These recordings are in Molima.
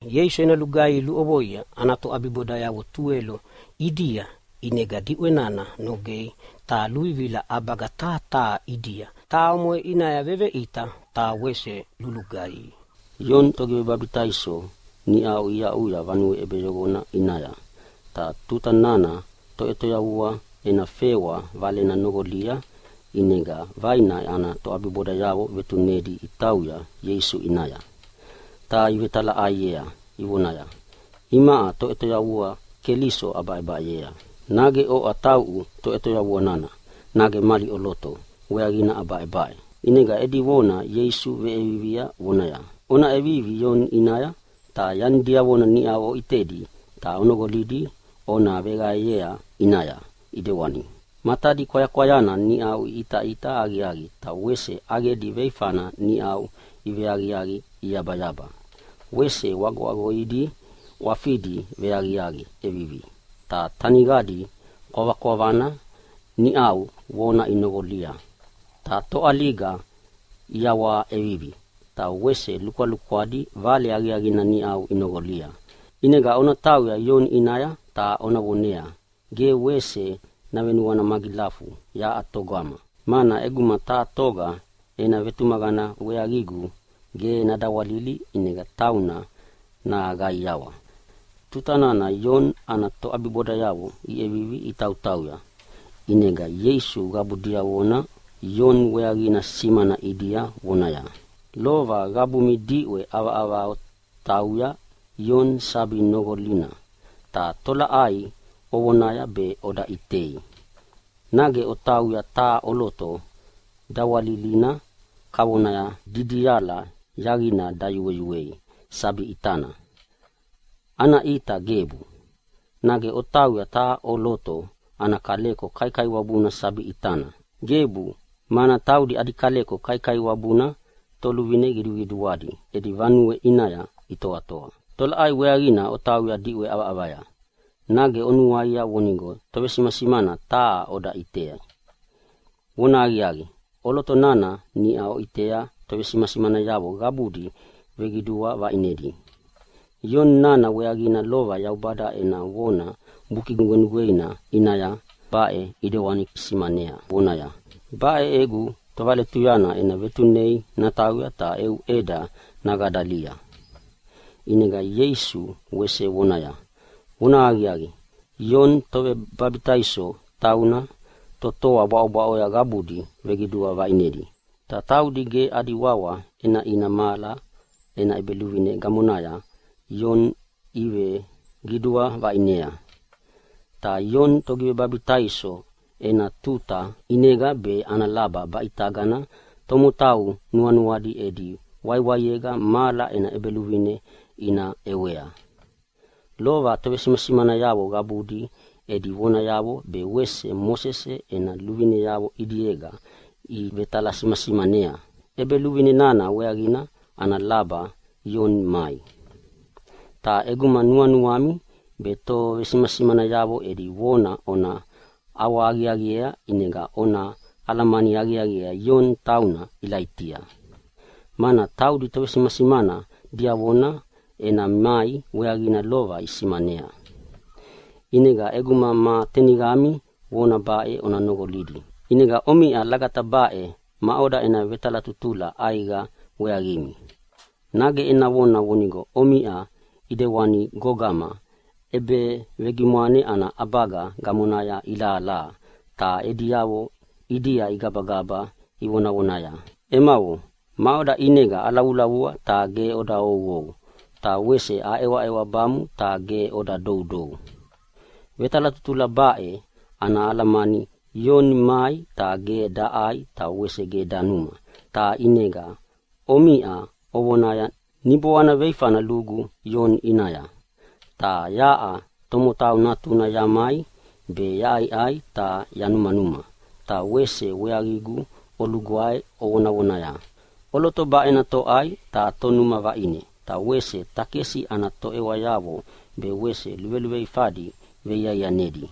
Ieisu ena lugaihi luʼovoia ana toʼabibodayavo tuwelo ʼidia, ʼinega diʼwe nana nogea ta luvivila ʼabaga taha taha ʼidia, ta omoʼe ʼinaya veveʼita ta wese lulugaihi. Ioni Togivebabitaiso niʼau iaʼuya vanue ʼebeyoqona ʼinaya, ta tuta nana Toʼetoyavua ena fewa valena noqolia, ʼinega vaina ana toʼabibodayavo vetunedi itauya Ieisu ʼinaya, ta ivetalaʼaiea ivonaya, “Imaʼa Toʼetoyavua Keliso abaʼebaʼeyea. Nage oʼa tauʼu Toʼetoyavuauna, nage mali ʼoloto weaqina ana baʼebaʼe?” ʼInega edi vona Ieisu veʼevivia vonaya, “Ona ʼevivi Ioni ʼinaya ta yani diavona niʼau oʼitedi ta onoqolidi ona veqaeyea ʼinaya, ʼidewani matadi kwayakwayana niʼau iʼitaʼita aqiaqi ta wese ʼaqedi veifana niʼau iveaqiaqi iyabayaba, wese ʼwagoʼwagoidi ʼwafidi veaqiaqi ʼevivi, ta taniqadi kwavakwavana niʼau vona inoqonoqolia, ta toʼaliga iyawaha ʼevivi, ta wese lukwalukwadi vale aqiaqina niʼau inoqolia. ʼInega ona tauya Ioni ʼinaya ta ona vonea ge wese navenuana magilafu yaʼa togama, mana ʼeguma taha toga ena vetumaqana weaqigu gebu nadawalili ʼinega tauna naqaiawa.” Tuta nana Ioni ana toʼabibodayavo iʼevivi itautauya, ʼinega Ieisu qabu diavona Ioni weaqina simana ʼidia vonaya, “Lova qabumi diʼwe ʼavaʼavaya otauya Ioni sabi noqolina, ta tolaʼai ovonaya be oda ʼitei? Nage otauya taha ʼoloto dawalilina kavona didiala yaqina dayueyuei sabi ʼitana? Ana ʼita gebu. Nage otauya taha ʼoloto ana kaleko kaikaiwabuna sabi ʼitana? Gebu, mana taudi adi kaleko kaikaiwabuna toluvine qiduqiduadi edi vanuea itoatoa. Ta tolaʼai weaqina otauya diʼwe ʼavaʼavaya? Nage onuaia vonigo tovesimasimana taha oda ʼitei? Vonahaqiaqi, ʼoloto nana niʼa oʼitea tovesimasimanayavo qabudi veqidua vaʼinedi. Ioni nana weaqina lova Yaubada ena vona Buki Nugwenugweina ʼinaya baʼe ʼidewani simanea vonaya, ‘Baʼe egu tovaletuyana ena vetunea natauya ta eu ʼeda naqadalia.’” ʼInega Ieisu wese vonaya, “Vonahaqiaqi, Ioni Togivebabitaiso tauna totoa bwaʼobwaʼo qabudi veqidua vaʼinedi, ta taudi ge adi wawa ʼenaʼina mahala ena ʼEbeluvine gamonaya Ioni iveqidua vaʼinea. Ta Ioni Togivebabitaiso ena tuta ʼinega be ana laba baʼitagana tomotau nuanuadi edi waiwaiega mahala ena ʼEbeluvine ina ʼewea. Lova tovesimasimanayavo qabudi edi vonayavo be Mosese ena luvineavo ʼidiega ivetalasimasimanea ʼEbeluvine nana weaqina ana laba Ioni mai. Ta ʼeguma nuanuami be tovesimasimanayavo edi vona ona ʼawahaqiaqiea ʼinega ona alamani aqiaqiea Ioni tauna Ilaitia. Mana taudi tovesimasimana diavona ena mai weaqina lova isimanea. ʼInega ʼeguma ma teniqami vona baʼe ona noqolidi! “ʼInega omiʼa lagata baʼe maʼoda ena vetalatutula ʼaiqa weaqimi? Nage ena vonaya vonigo omiʼa ʼidewana gogama ʼebevegimwane ana ʼabaga gamonaya ilahalaha ta ediavo ʼidia igabagaba ivonavonaya, ‘Emavo, maʼoda ʼinega alavulavua ta ge oda ouou. Ta wese aʼewaʼewabamu ta ge oda doudou.’ Vetalatutula baʼe ana alamani, Ioni mai ta ge daʼai ta wese ge danuma, ta ʼinega omiʼa ovonaya, ‘Niboana veifana lugu Ioni ʼinaya.’ Ta yaʼa Tomotau Natuna yamai be yaʼaiʼai ta yanumanuma ta wese weaqigu olugwae ovonavonaya, ‘ʼOloto baʼena toʼai ta tonuma vaʼine, ta wese takesi ana toʼewayavo be wese luveluveifadi veiaianedi.’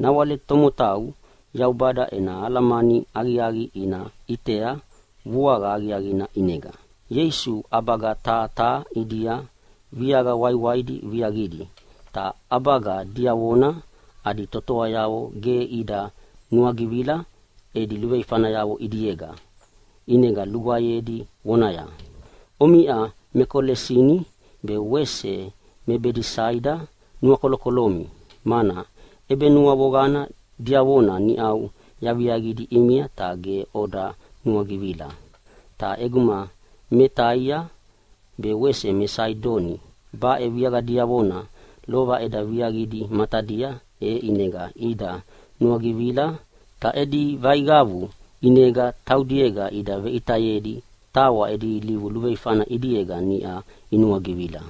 Nawale tomotau Yaubada ena alamani aqiaqi ina ʼitea vuaqa aqiaqina ʼinega.” Ieisu ʼabaga taha taha ʼidia viaqa waiwaidi viaqidi, ta ʼabaga diavona adi totoayavo ge ida nuagivila edi luveifayavo ʼidiega, ʼinega lugwaeyedi vonaya, “Omiʼa me Kolesini be wese me Bedesaida nuakolokolomi, mana ʼebenuavoqana diavona niʼau yaviaqidi ʼimia ta ge oda nuagivila. Ta ʼeguma me Taia be wese me Saidoni baʼe viaqa diavona lova eda viaqidi matadia e ʼinega ida nuagivila ta edi vaiqavu ʼinega taudiega ida veʼitayedi tawa edi ilivu luveifana ʼidiega niʼa inuagivila.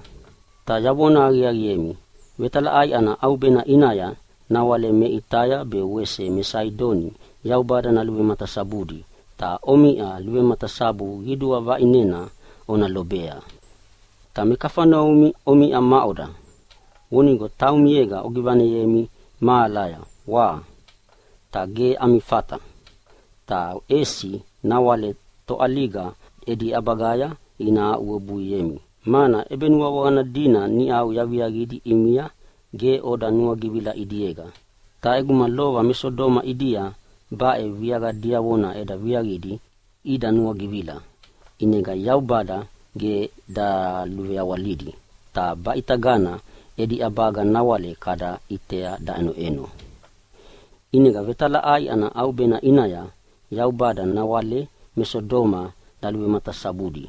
Ta yavona aqiaqiemi, vetalaʼai ana ʼaubena ʼinaya nawale me Taia be wese me Saidoni Yaubada naluvematasabudi, ta omiʼa luvematasabu qidua vaʼinena ona lobea. Ta me Kafaneumi omiʼa maʼoda? Vonigo taumiega ogivaneyemi mahalaya, wa? Ta ge ami fata! Ta ʼesi nawale toʼaliga edi ʼabagaya ina aʼuwebuiemi, mana ʼebenuavoqana dina niʼau yaviaqidi ʼimia ge oda nuagivila ʼidiega. Ta ʼeguma lova me Sodoma ʼidia baʼe viaqa diavona eda viaqidi ida nuagivila, ʼinega Yaubada ge daluveawalidi ta baʼitagana edi ʼabaga nawale kada ʼitea daʼenoʼeno. ʼInega vetalaʼai ana ʼaubena ʼinaya Yaubada nawale me Sodoma naluvematasabudi,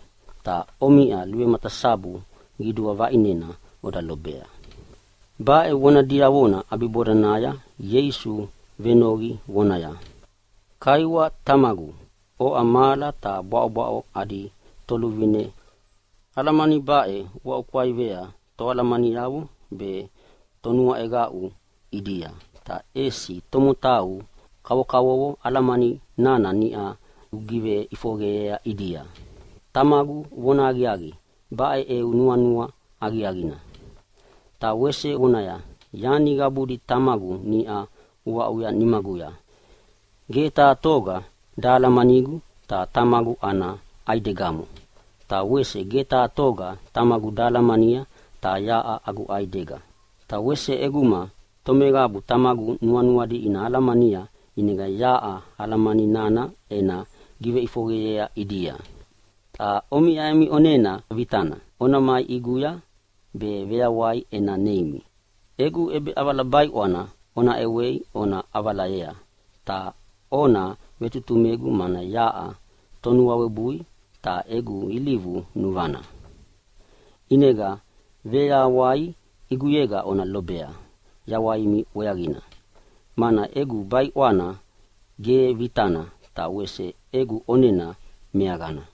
ta omiʼa luvematasabu qidua vaʼinena ona lobea.” Baʼe vona diavona ʼabibodanaya Ieisu venoqi vonaya, “Kaiwa Tamagu, oʼa mahala ta bwaʼobwaʼo adi Toluvine, alamani baʼe uaʼukwaivea toalamaniavo ta tonuaʼeqaʼu ʼidia, ta ʼesi tomotau kavokavovo alamani nana niʼa ugiveʼifoqeyea ʼidia. Tamagu, vonahaqiaqi baʼe eu nuanua aqiaqina.” Ta wese vonaya, “Yani qabuna Tamagu niʼa aʼuya nimaguya. Ge taha toga dahalamanigu ta Tamagu ana ʼaidegamo. Ta wese ge taha toga Tamagu dahalamania, ta yaʼa agu ʼaidega. Ta wese ʼeguma tomeqabu Tamagu nuanuadi ina alamania ʼinega yaʼa alamani nana ena giveʼifoqeyea ʼidia. “Ta omiʼa emi ʼonena vitana ona mai ʼiguya be veyawai ena neimi. Egu ʼebeʼavala baiʼwana ona ʼewei ona ʼavalayea, ta ona vetutumegu mana yaʼa tonuawebui ta egu ilivu nuvana, ʼinega veyawai ʼiguyega ona lobea yawaimi weaqina. Mana egu baiʼwana ge vitana, ta wese egu ʼonena meaqana.”